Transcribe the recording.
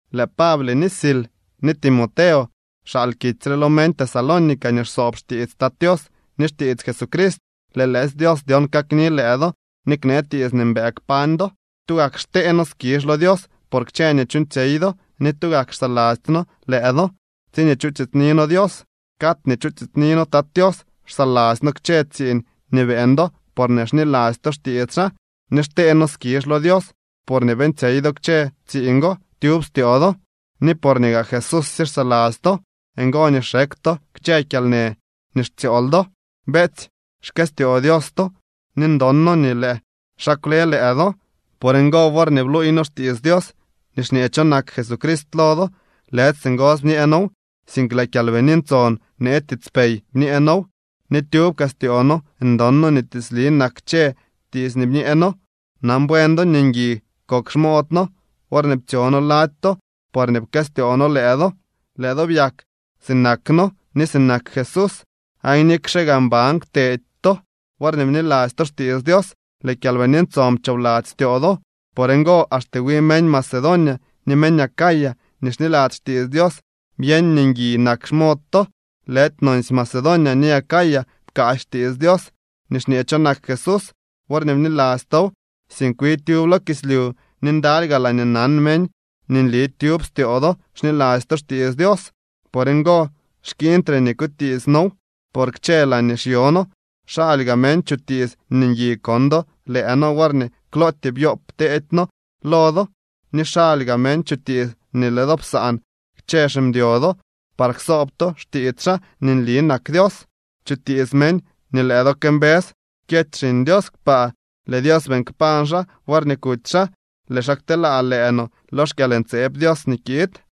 Lëë Pable ni Sil ni Timoteo xaal kitsy re lo meñ Tesalónica nii xsoob xtiits Tat Tios ni xtiits Jesucrist. Lëë lëësy Dios dyon kakni lëë do ni knee tiits nii mbëë kpañ do. Tugak xtee noo skizh lo Dios por kchë nii chuuñtsyey do ni tugak xsaladzy noo lëë do tsiñee chutiitsni noo Dios. Cad nii chutiitsni noo Tat Tios, xsaladzy noo kchë tsiiñ nii beeñ do porñee xniladzy to xtiits xaa. Ni xtee noo skizh lo Dios porñee beeñtsyey do kchë tsiiñ go tyub styoo do. Ni porñee gaa Jesúsye xsaladzy to, ngo nii xekw to kchë kyalnë nii xtsyool do. Beetsy, xkëstyoo Dios to, ni ndon noo nii lëë xaa kwle lëë do. Por ngo, worñee bluuy noo xtiits Dios nii xñee cho nak Jesucrist lo do, lëdy singosy bñee noow, sink lëë Kyalbini Ntson bnee tiitspey bñee noow, ni tyub kaa styoo noo ndon noo nii tiitsli nak kchë tiits nii bñee noo. Nan buen do nii ngui kok xmood noo worñee ptsyo noo lady to porñee pkëstyoo noo lëë do. Lëë do byak sinak noo ni sinak Jesús, aan nikxe gaa mban kwtedy to worñee bniladzy to xtiits Dios, lëë Kyalbini Ntson pchoobladzy styoo do. Por ngo, axte wi meñ Macedonia ni meñ Acaya nii xniladzy xtiits Dios byeñ nii ngui nak xmod to. Lëdy nonsy Macedonia ni Acaya pkaasy xtiits Dios nii xñee cho nak Jesús worñee bniladzy tow, sink wi tyub lo kislyu ni ndaly gaa laañee nan meñ nii nli tyub styoo do xniladzy to xtiits Dios. Por ngo xkiiñtre nii kutiits noow. Por kchë laañee xyo noo xaly gaa meñ chutiits nii ngui kon do lëë noo worñee klootyee byoob teedy noo lo do ni xaly gaa meñ chutiits nii lëë do psaan kchë ximdyo do par ksoob to xtiits xaa nii nli nak Dios. Chutiits meñ nii lëë do këmbës kyety Xiñ Dios kpaa. Lëë Dios beeñ kpañ xaa worñee kuty xaa. Lëë xaa kteelaa lëë no lo xkyalntseeb Dios nii kiid.